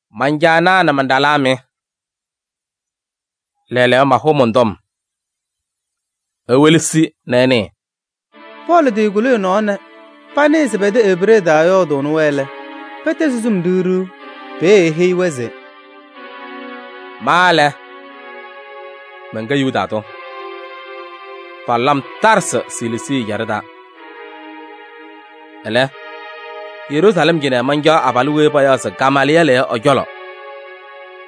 “Man-caanaa nɛ man-ɖalaa mɩ! Lɛɛlɛɛyɔ, mahʋʋ mɔn-tɔm, iwelesi nɛ ɩnɩɩ.” Pɔɔlɩ tɩkuli ɛ-nɔɔ nɛ panɩɩ se pɛ-tɛ Ebree taa ɛyɔɔdɩnɩ-wɛ lɛ, pɛtɛzɩ sum ɖiɣ ɖiɣ. Peeye eheyi-wɛ se: “Ma lɛ, mɛnkɛ Yuda tʋ, palʋlɩ-m Taarsɩ Siliisii ɛjaɖɛ taa. Ɛlɛ, Yeruusalɛm cɩnɛ mancaɣ abalʋ weyi payaɣ se Gamaalɩyɛɛlɩ yɔ ɛ-cɔlɔ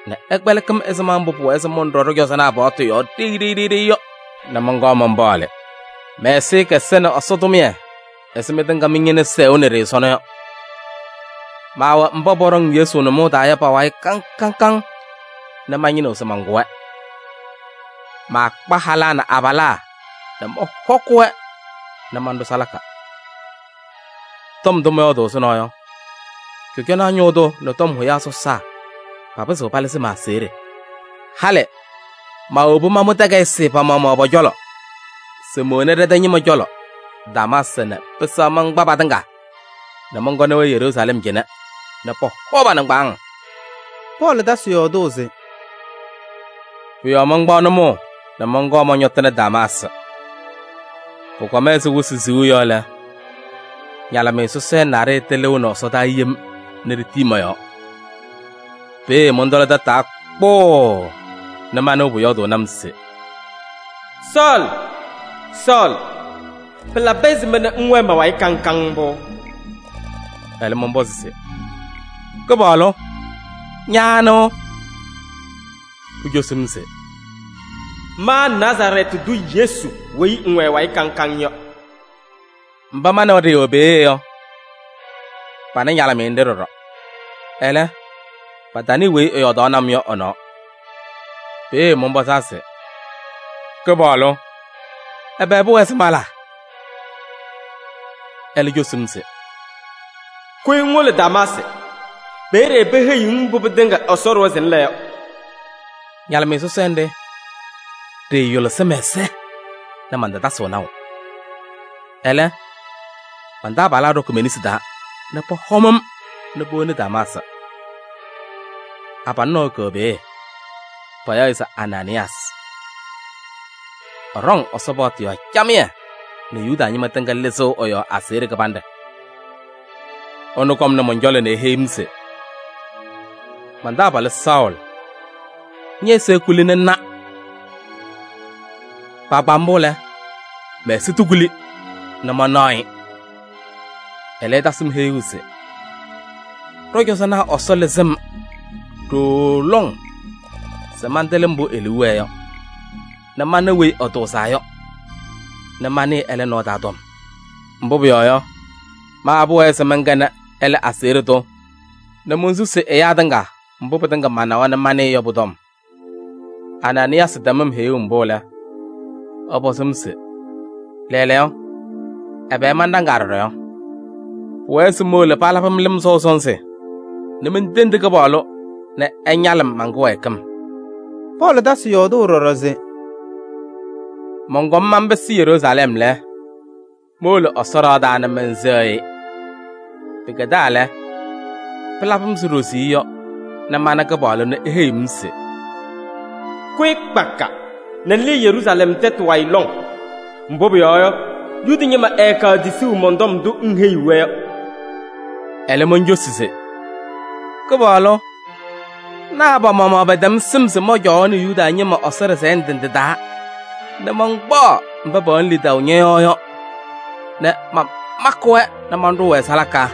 nɛ ɛkpɛlɩkɩ-m ɛzɩma mbʋ pʋwɛɛ se mɔnɖɔ ɖɔ-cɔzɔnaa paɣtʋ yɔɔ ɖeyi ɖeyi yɔ nɛ mɔnkɔɔ manpaɣlɩ. Mɛ-ɛzɩyɛ kɛsɛnɩ Ɛsɔ tʋmɩyɛ ɛzɩ mɩtɩŋa mɩ-ñɩna sɛʋnɩ-ɖɩ sɔnɔ yɔ. Maawɛ mba pɔɖɔŋ Yesu nʋmɔʋ taa yɔ pa-wayɩ kaŋ kaŋ nɛ mañɩnɩɣ se mankʋ-wɛ. Maakpa halaa nɛ abalaa nɛ mɔhɔkɩ-wɛ nɛ manɖʋ salaka. Tɔm ndʋ mɔyɔɔdʋʋ ɛzʋnɔ yɔ, cɔjɔnaa ñʋʋ tʋ nɛ tɔm hʋyaa sɔsaa papɩzɩɣ palɩzɩ ma-aseɣɖe. Halɩ maawobi mamʋ takayɩsɩ pa-maɣmaɣ pɔ-cɔlɔ se mowoni ɖɛ-tɛ ñɩma cɔlɔ Damaasɩ nɛ pɩsɛɣ mankpa patɩŋa nɛ mɔnkɔnɩ-wɛ Yeruusalɛm cɩnɛ nɛ pɔhɔ pa-nɩŋgbaaŋ.” Pɔɔlɩ tasɩ yɔɔdʋʋ se: “Pʋ-yɔɔ mankpaɣ nʋmɔʋ nɛ mɔnkɔɔ mɔñɔtɩnɩ Damaasɩ. Pʋkɔm ɛzɩ wɩsɩ siɣu yɔ lɛ, ñalɩmɩyɛ sɔsɔɖɛ naɖɩyɛ tɩlɩʋnɩ ɛsɔdaa yem nɛ ɖitii mɔ-yɔɔ. Peeye mɔntɔlɩ tataa kpʋʋʋ nɛ manɩɣ pʋyɔɔdʋʋnɩ-m se: ‘Sɔɔlɩ! Sɔɔlɩ! Pɩlabɩ ɛzɩma nɛ ŋwɛɛ ma-wayɩ kaŋ kaŋ mbʋ?’ Ɛlɛ mɔnpɔzɩ se: ‘Kɩpaɣlʋ! Ña anɩ?’ Pucosi-m se: ‘Ma Nazarɛɛtɩ tʋ Yesu weyi ŋwɛ ɛ-wayɩ kaŋ kaŋ yɔ.’ Mba ma nɛ wɛ ɖɩɩwɛ peeye yɔ, pana ñalɩmɩyɛ nɖɩ ɖɔɖɔ. Ɛlɛ, patanɩɩ weyi ɛyɔɔdaɣnɩ-m yɔ ɛ-nɔɔ. Peeye mɔnpɔzaa se: ‘Kɩpaɣlʋ! Ɛbɛ pʋwɛɛ se mala?’ Ɛlɛ cosi-m se: ‘Kʋyɩ ŋwolo Damaasɩ, peeye peheyiɣ-ŋ mbʋ pɩtɩŋa Ɛsɔ ɖʋwa se ŋla yɔ.’ Ñalɩmɩyɛ sɔsɔɖɛ nɖɩ, ɖɩɩyʋlɩsɩ mɛ-ɛza nɛ maatasɩɣ naʋ. Ɛlɛ, man-taabalaa ɖɔkɩ me-nesi taa nɛ pɔhɔm-m nɛ powoni Damaasɩ. Abalʋ nɔɔyʋ kɛwɛ peeye, payaɣ-ɩ se Anaanɩyaasɩ. Ɛɖɔŋ Ɛsɔ paɣtʋ yɔɔ camɩyɛ nɛ Yuda ñɩma tɩŋa lɩzɩɣ ɛ-yɔɔ aseɣɖe kɩbanɖɛ. Ɛnʋ kɔmnɩ mɔn-cɔlɔ nɛ eheyi-m se: ‘Man-taabalʋ Sɔɔlɩ! Ñɛ-ɛza ekuli nɛ ŋna!’ Kpaagbaa mbʋ lɛ, mɛ-ɛza tɩkuli nɛ manaɣ-ɩ. Ɛlɛ ɛtasɩ-m heyuu se ɖɔ-cɔzɔnaa Ɛsɔ lɩzɩ-m ɖooo lɔŋ se mantɩlɩ mbʋ e-liu wɛɛ yɔ nɛ mana Weyi Ɛtʋʋzaa yɔ nɛ manɩɩ ɛlɛ nɔɔ taa tɔm. Mbʋ pʋyɔɔ yɔ, ma pʋwɛɛ se mɛnkɛnɩ ɛlɛ aseɣɖe tʋ nɛ monsusi ɛyaa tɩŋa mbʋ pɩtɩŋa manawa nɛ manɩɩ yɔ pʋ-tɔm. Anaanɩyaasɩ tɛm-m heyuu mbʋ lɛ, ɛpɔzɩ-m se lɛɛlɛɛyɔ, ɛbɛ manɖaŋaa ɖɔɖɔ yɔ? Pʋwɛɛ se mowolo palabɩ-m lɩm sɔʋ sɔnzɩ nɛ mentendi Kɩpaɣlʋ nɛ ɛñalɩ-m man-kɩwɛɛkɩm.” Pɔɔlɩ tasɩ yɔɔdʋʋ ɖɔɖɔ se: “Mɔnkɔm manpɩsɩ Yeruusalɛm lɛ, mowolo Ɛsɔ ɖɩɣa taa nɛ mɛnsɛɣ-ɩ. Pɩkɛdaa lɛ, pɩlabɩ-m ɛzɩ ɖoziye yɔ nɛ mana Kɩpaɣlʋ nɛ eheyiɣ-m se: ‘Kʋyɩ kpaka nɛ ŋlɩɩ Yeruusalɛm tɛtʋ wayɩ lɔŋ, mbʋ pʋyɔɔ yɔ, Yuda ñɩma ɛɛkaɣ tisuu mɔn-tɔm ndʋ ŋheyiɣ-wɛ yɔ.’ Ɛlɛ moncosi se: ‘Kɩpaɣlʋ! Naa pa-maɣmaɣ pɛtɛm sɩm se mɔncɔwaɣnɩ Yuda ñɩma Ɛsɔ ɖɩsɛyɛ ndɩ ndɩ taa nɛ mankpaɣ mba pɛwɛnɩ lidaʋ ñɔ-yɔɔ yɔ nɛ mamakɩ-wɛ nɛ maɖʋʋ-wɛ salaka!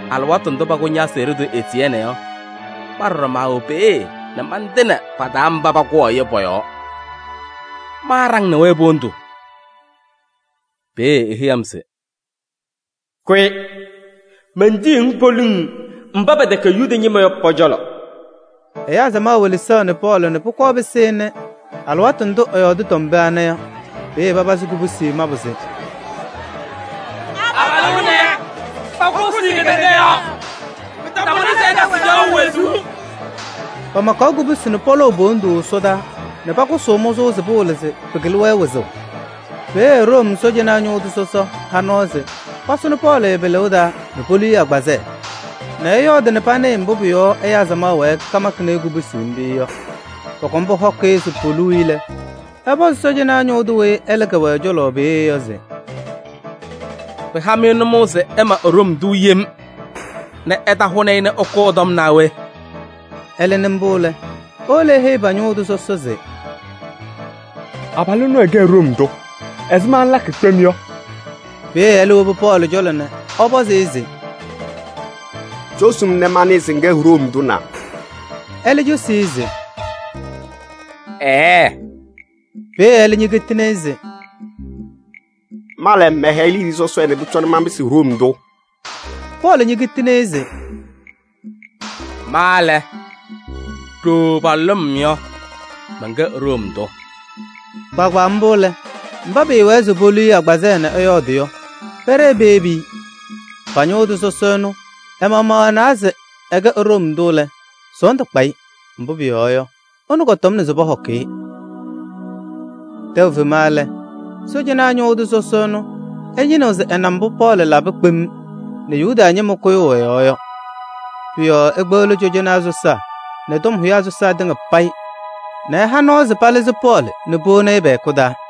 Alɩwaatʋ ndʋ pakʋ ña-aseɣɖe tʋ Etiyɛɛnɩ yɔ, ma ɖɔɖɔ maawɛ peeye nɛ mantɩnɩ pa-taa mba pakʋwaɣ-ɩ yɔ pɔ-yɔɔ. Maaɖaŋnɩ-wɛ po-wondu.’ Peeye eheyi-m se: ‘Kʋyɩ! Mentiyiɣ-ŋ poliŋ, mba pɛtɛkɛ Yuda ñɩma yɔ pɔ-cɔlɔ.’” Ɛyaa samaɣ welesaɣnɩ Pɔɔlɩ nɛ pʋkɔɔ pɩsɩnɩ alɩwaatʋ ndʋ ɛyɔɔdɩ tɔm pee ana yɔ. Peeye papazɩ kubusi mabʋ se: “Abalʋ ɛnɛ, pakʋsɩ-ɩ kedeŋa yɔɔ! Pɩtamʋnɩ se ɛtasɩ caɣʋ wezuu!” Pamakaɣ kubusi nɛ pɔlɔʋ po-wondu ɛsɔdaa nɛ pakʋsʋʋ mʋzʋʋ se pɩwɩlɩ se pɩkɩlɩ-wɛ wɩzʋʋ. Peeye Room sɔɔjanaa ñʋʋ tʋ sɔsɔ ha nɔɔ se pasʋnɩ Pɔɔlɩ pa-pɩlɩʋ taa nɛ polu-i agbazɛɛ nɛ ɛyɔɔdɩ nɛ panɩɩ mbʋ pʋ-yɔɔ ɛyaa samaɣ wɛɛ kamakɩnɩ-ɩ kubusi mbʋ yɔ. Pɔkɔm pɔhɔkɩ-ɩ se poluu-i lɛ, ɛpɔzɩ sɔɔjanaa ñʋʋ tʋ weyi ɛlɛ kɛwɛ ɛ-cɔlɔ peeye yɔ se: “Pɩha-mɩ nʋmɔʋ se ɩma Room tʋ yem nɛ ɩtahʋnɩ-ɩ nɛ ɩkʋ ɛ-tɔm naa we?” Ɛlɛ nɩ mbʋ lɛ, ewolo eheyi pa-ñʋʋ tʋ sɔsɔ se: “Abalʋ ɛnʋ ɛkɛ Room tʋ! Ɛzɩma ŋlakɩ kpem yɔ?” Peeye ɛlɛ ñowobi Pɔɔlɩ cɔlɔ nɛ ɛpɔzɩ-ɩ se: “Cosi-m nɛ manɩɩ se ŋkɛ Room tʋ na?” Ɛlɛ cosi-i se: “Ɛɛɛ!” Peeye ɛlɛ ñekitini-i se: “Ma lɛ, mɛhɛyɩ liidiye sɔsɔɖɛ nɛ pʋcɔ manpɩsɩ Room tʋ.” Pɔɔlɩ ñekitini-i se: “Ma lɛ, ɖooo palʋlʋʋ-m yɔ, mɛnkɛ Room tʋ.” Kpaagbaa mbʋ lɛ, mba pɩɩwɛɛ se polu-i agbazɛɛ nɛ ɛyɔɔdɩ yɔ, pɛɖɛɛ peyebi-i. Pa-ñʋʋ tʋ sɔsɔ ɛnʋ ɛ-maɣmaɣ ɛnawa se ɛkɛ Room tʋ lɛ, sɔɔndʋ kpa-ɩ, mbʋ pʋyɔɔ yɔ, ɛnʋ kɔtɔmnɩ se pɔhɔkɩ-ɩ. Tɛʋ fema lɛ, sɔɔjanaa ñʋʋ tʋ sɔsɔ ɛnʋ ɛñɩnɩɣ se ɛna mbʋ Pɔɔlɩ labɩ kpem nɛ yuda ñɩma kʋyʋʋ ɛ-yɔɔ yɔ. Pʋ-yɔɔ ekpeɣli cɔjɔnaa sɔsaa nɛ tɔm hʋyaa sɔsaa tɩŋa payɩ nɛ ɛha nɔɔ nɛ palɩzɩ Pɔɔlɩ nɛ powoni-i pɛ-hɛkʋ taa.